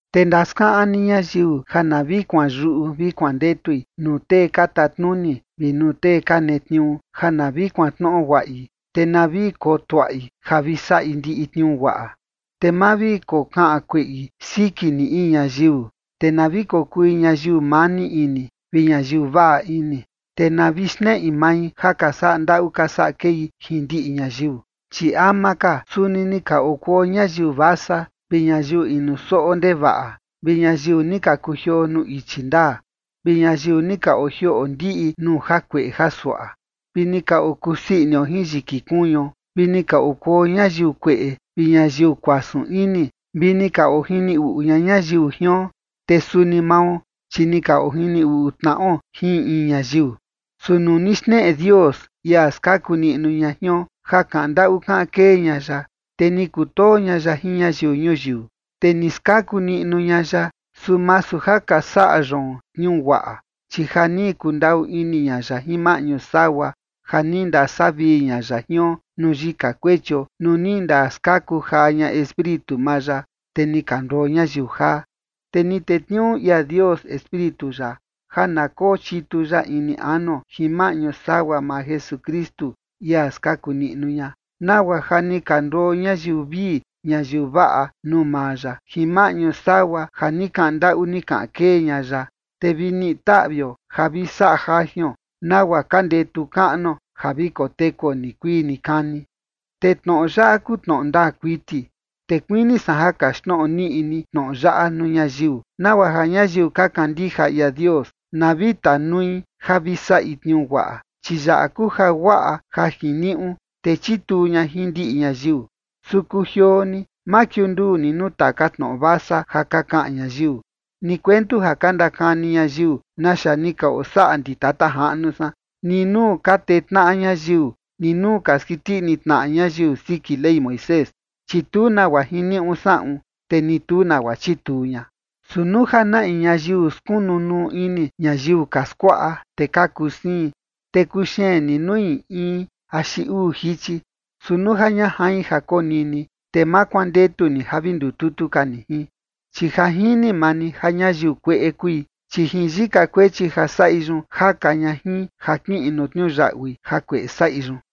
Te ndaskaꞌan ni ñayiu ja na vi kuanyuꞌu vi kuandetui nuu tee ka tatnuni vi nuu tee ka netniuu ja na vi kuantnoꞌo guaꞌi, te na vi kotuaꞌi ja vi saꞌi ndiꞌi tniuu guaꞌa. Te ma vi kokaꞌan kueꞌi siki ni in ñayiu, te na vi kokui ñayiu mani ini vi ñayiu vaꞌa ini, te na vi xneꞌi mai ja ka saꞌa ndaꞌu ka saꞌa kei jin ndiꞌi ñayiu. Chi ama ka suni ni ka okuo ñayiu vasa, vi ñayiu inu soꞌo ndevaꞌa, vi ñayiu ni ka kujioo nuu ichi ndaa, vi ñayiu ni ka ojioꞌo ndiꞌi nuu jakueꞌe jasuaꞌa, vi ni ka okusii inio jin yiki kuñuo, vi ni ka okuo ñayiu kueꞌe vi ñayiu kuasun ini, vi ni ka ojini uꞌu ña ñayiu jion, te suni mao, chi ni ka ojini uꞌu tnaꞌo jin in in ñayiu. Su nuu ni xneꞌe Dios, ia skaku niꞌnu ña jion, ja kaꞌan ndaꞌu kaꞌan kee ña ya, te ni kutoo ña ya jin ñayiu ñuyiu, te ni skaku niꞌnu ña ya, su masu ja ka saꞌa yoon tniuu guaꞌa, chi ja ni kundaꞌu ini ña ya jin maꞌñu sagua ja ni ndasavii ña ya jion nuu yika kuechio nuu ni ndaskaku jaa ña Espíritu maa ya, te ni ka nduo ñayiu jaa. Te ni tetniuu ia Dios Espíritu ya ja na kochitu ya ini anuo jin maꞌñu sagua maa Jesukristu, ia skaku niꞌnu ña, nagua ja ni ka nduo ñayiu vii ñayiu vaꞌa nuu maa ya jin maꞌñu sagua ja ni kaꞌan ndaꞌu ni kaꞌan kee ña ya, te vi niꞌi taꞌvio ja vi saꞌa jajion nagua ka ndetu kaꞌnuo ja vi kotekuo nikuii nikani. Te tnoꞌo yaꞌa kuu tnoꞌo ndaa kuiti, te kuini san ja kaxtnoꞌo niꞌi ni tnoꞌo yaꞌa nuu ñayiu, nagua ja ñayiu ka kandija ia Dios na vi tanui ja vi saꞌi tniuu guaꞌa, chi yaꞌa kuu jaguaꞌa ja jiniuꞌu, te chituu ña jin ndiꞌi ñayiu. Su kujioo ni, ma kiunduu ni nuu taka tnoꞌo vasa ja ka kaꞌan ñayiu, ni kuentu ja ka ndakani ñayiu naxa ni ka osaꞌa ndi tata jaꞌnu san, ni nuu ka tee tnaꞌa ñayiu, ni nuu ka skiti ini tnaꞌa ñayiu siki Ley Moisés, chi tu nagua jiniuꞌu saꞌun, te ni tu nagua chituu ña. Su nuu ja na in ñayiu skunu nuu ini ñayiu ka skuaꞌa, te ka kuu siin, te kuxeen ni nui in axi uu jichi. Su nuu ja ña jain ja konini, te ma kuandetu ni ja vi ndututu ka ni jin. Chi ja jini maa ni ja ñayiu kueꞌe kui, chi jin yika kuechi ja saꞌi yun jaka ña jin ja kiꞌin nuu tniuyaꞌui jakueꞌe saꞌi yun.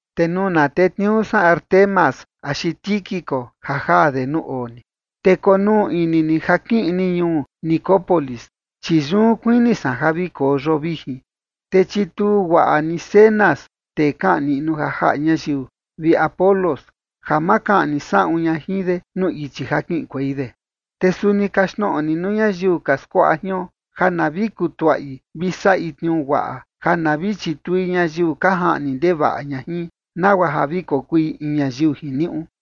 Te nuu na tetniuu san Artemas axi Tíquico ja jaa de nuu oo ni, te konuu ini ni ja kiꞌin ni ñuu Nicópolis, chi yun kuini san ja vi koo yoo vijin. Te chituu guaꞌa ni Zenas, tee kaꞌan niꞌnu ja jaꞌa ñayiu, vi Apolos, ja ma kaꞌni saꞌun ña jin de nuu ichi ja kiꞌinkuei de. Te suni kaxtnoꞌo ni nuu ñayiu ka skuaꞌa jion ja na vi kutuaꞌi vi saꞌi tniuu guaꞌa ja na vi chitui ñayiu ka jaꞌni ndevaꞌa ña jin, nagua ja vi kokui in ñayiu jiniuꞌu.